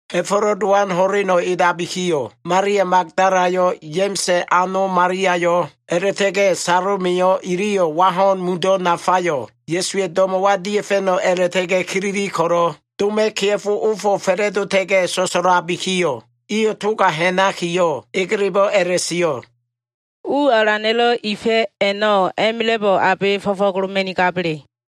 Ha꞉fo꞉lo꞉ Dowan ho꞉leno꞉ edabikiyo꞉, Malia Magdalayo꞉, Ya꞉ma꞉sa꞉ ano Maliayo꞉, a꞉la꞉ta꞉ga꞉ Salomeyo꞉ iliyo꞉ wa ho꞉n mundo꞉ nafayo꞉ Ya꞉suwa꞉ do꞉mo꞉wa dia꞉fa꞉no꞉ a꞉la꞉ta꞉ga꞉ kilili ko꞉lo꞉, doma꞉ kea꞉fo, ofo꞉ fa꞉la꞉dota꞉ga꞉ so꞉so꞉labikiyo꞉, iyo꞉ toga ha꞉nakiyo꞉ egelebo꞉ a꞉la꞉sio꞉, “U alana꞉lo꞉ ifa꞉ a꞉no꞉, a꞉ma꞉la꞉bo꞉ abe fo꞉fo꞉goloma꞉nigaba꞉le?”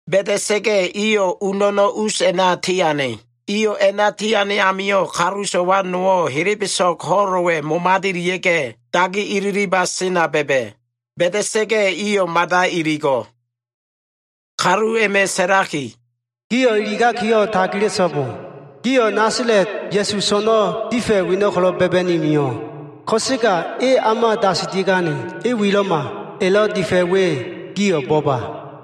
Ba꞉da꞉sa꞉ga꞉, iyo꞉ u no꞉no꞉ us a꞉na tiane. Iyo꞉ a꞉na tiane amio꞉, kalu so꞉wa nowo꞉, helebeso꞉g ho꞉lo꞉wa꞉ momadelia꞉ga꞉, dagi ililiba sena ba꞉ba꞉. Ba꞉da꞉sa꞉ga꞉ iyo꞉ mada iligo꞉. Kalu a꞉ma꞉ sa꞉laki, “Gio꞉ iligakiyo꞉ tagila꞉so꞉bo! Gio꞉ Nasala꞉t Ya꞉su so꞉no꞉ difa꞉ weno꞉ ko꞉lo꞉ ba꞉ba꞉ni mio꞉. Ko꞉sega e o꞉ma dasilia꞉gane. E wilo꞉ma. Elo꞉ difa꞉ we, gio꞉ bo꞉ba.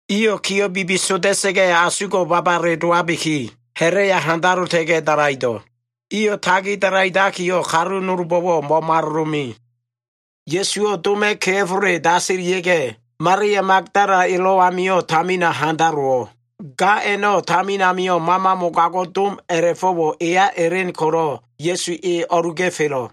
Iyo꞉ kiyo꞉ bibisoda꞉sa꞉ga꞉, asugo꞉ babale dowabiki, ha꞉la꞉ya handalota꞉ga꞉ dalaido꞉. Iyo꞉ tagi dalaidakiyo꞉, kalu nolbo꞉wo꞉ mo꞉malolome. Ya꞉suwo꞉ doma꞉ kea꞉fole dasilia꞉ga꞉, Malia Magdala elo꞉ amio꞉ tamina handalowo꞉. Ga a꞉no꞉ tamin amio꞉ mama mogago꞉ dom a꞉la꞉fo꞉wo꞉ eya elen ko꞉lo꞉, Ya꞉su e o꞉luga꞉felo꞉.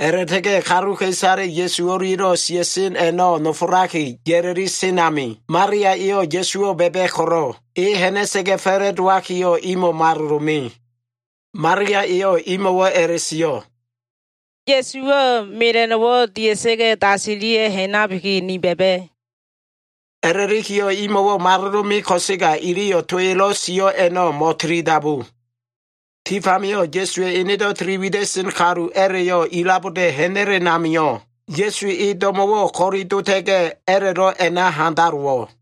A꞉la꞉ta꞉ga꞉ kaluka꞉isale Ya꞉su o꞉lia꞉lo꞉ sia꞉sen a꞉no꞉ nofolaki ya꞉la꞉li sen ami, Malia eyo꞉ Ya꞉suwo꞉ ba꞉ba꞉ ko꞉lo꞉, e ha꞉na꞉sa꞉ga꞉ fa꞉la꞉dowakiyo꞉ imo꞉ malolome. Malia eyo꞉ imo꞉wo꞉ a꞉la꞉sio꞉, “Ya꞉suwo꞉ mela꞉no꞉wo꞉ dia꞉sa꞉ga꞉ dasilia꞉ ha꞉nabiki, ni ba꞉ba꞉” a꞉la꞉likiyo꞉, imo꞉wo꞉ malolome ko꞉sega, iliyo꞉ to elo꞉ sio꞉ a꞉no꞉ mo꞉tilidabu. Tif amio꞉ Ya꞉suwa꞉ enedo꞉ tili wida꞉sen kalu a꞉la꞉yo꞉ ilaboda꞉ ha꞉na꞉len amio꞉, Ya꞉su e do꞉mo꞉wo꞉ ko꞉li dota꞉ga꞉, a꞉la꞉lo꞉ a꞉na handalowo꞉.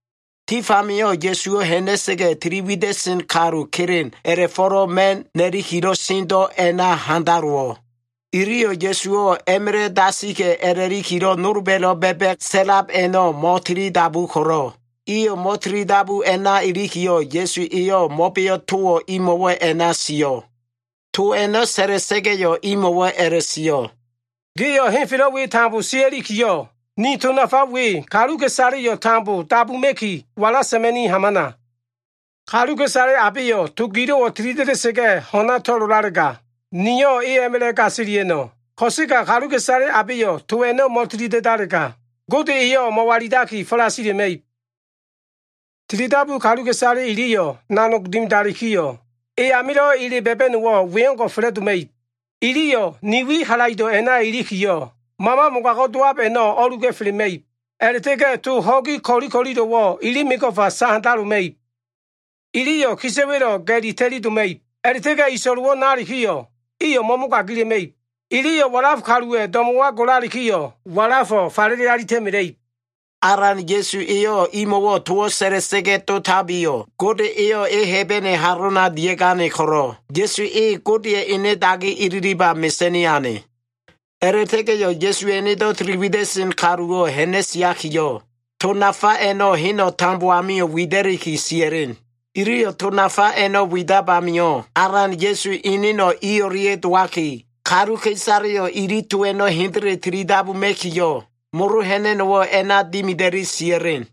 Tif amio꞉ Ya꞉suwo꞉ ha꞉na꞉sa꞉ga꞉, tili wida꞉sen kalu kelen a꞉la꞉fo꞉lo꞉ ma꞉n na꞉likilo꞉ sendo꞉ a꞉naka handalowo꞉. Iliyo꞉ Ya꞉suwo꞉ a꞉ma꞉la꞉ dasika꞉ a꞉la꞉likilo꞉, nolba꞉lo꞉ ba꞉ba꞉ sa꞉lab a꞉no꞉ mo꞉tilidabu ko꞉lo꞉, iyo꞉ mo꞉tilidabu a꞉na ilikiyo꞉, Ya꞉su eyo꞉ mo꞉beo꞉ towo꞉ imo꞉wo꞉ a꞉na sio꞉. To a꞉no꞉ sa꞉la꞉sa꞉ga꞉yo꞉, imo꞉wo꞉ a꞉la꞉sio꞉, “Gio꞉ henfelo꞉ we tambo sia꞉likiyo꞉, ni to nafa we kaluka꞉isaleyo꞉ tambo dabuma꞉ki, walasa꞉ma꞉ni hamana! Kaluka꞉isale abeyo꞉ to gilo꞉wo꞉ tilida꞉da꞉sa꞉ga꞉ ho꞉na to꞉lolalega, niyo꞉ e a꞉ma꞉la꞉ gasilia꞉no꞉. Ko꞉sega kaluka꞉isale abeyo꞉ to a꞉no꞉ mo꞉tilida꞉dalega, Gode eyo꞉ mo꞉walilaki falasila꞉ma꞉ib Tilidabu kaluka꞉isale iliyo꞉ nanog dimidalikiyo꞉, e amilo꞉ ele ba꞉ba꞉no꞉wo꞉ we o꞉ngo꞉ fa꞉la꞉doma꞉ib. Iyo꞉ ne wi halaido꞉ a꞉na ilikiyo꞉, mama mogago꞉ dowab a꞉no꞉ o꞉luga꞉felema꞉ib. A꞉la꞉ta꞉ga꞉ to ho꞉gi ko꞉li ko꞉lilo꞉wo꞉ ili mego꞉fa sahandaloma꞉ib. Iliyo꞉ kisa꞉wa꞉lo꞉ ga꞉li ta꞉li doma꞉ib. A꞉la꞉ta꞉ga꞉ iso꞉lo ibo꞉ nalikiyo꞉, iyo꞉ mo꞉mogagila꞉ma꞉ib. Iliyo꞉ walaf kaluwa꞉ do꞉mo꞉wa golalikiyo꞉, walafo꞉ falele alita꞉mela꞉ib.” Alan Ya꞉su eyo꞉ imo꞉wo꞉ towo꞉ sa꞉la꞉sa꞉ga꞉ dotabiyo꞉, Gode eyo꞉ e Hebene halona dia꞉gane ko꞉lo꞉, Ya꞉su e Godeya꞉ ene dagi ililiba mesa꞉ni ane. A꞉la꞉ta꞉ga꞉yo꞉ Ya꞉suwa꞉ enedo꞉ tili wida꞉len kaluwo꞉ ha꞉na꞉siakiyo꞉, to nafa a꞉no꞉ heno꞉ tambo amio꞉ wida꞉liki sia꞉len. Iliyo꞉ to nafa a꞉no꞉ widab amio꞉, Alan Ya꞉su eneno꞉ i o꞉lia꞉ dowaki, kaluka꞉isaleyo꞉ ili to a꞉no꞉ hendele tilidabuma꞉kiyo꞉, molo ha꞉na꞉no꞉wo꞉ a꞉na dimida꞉li sia꞉len.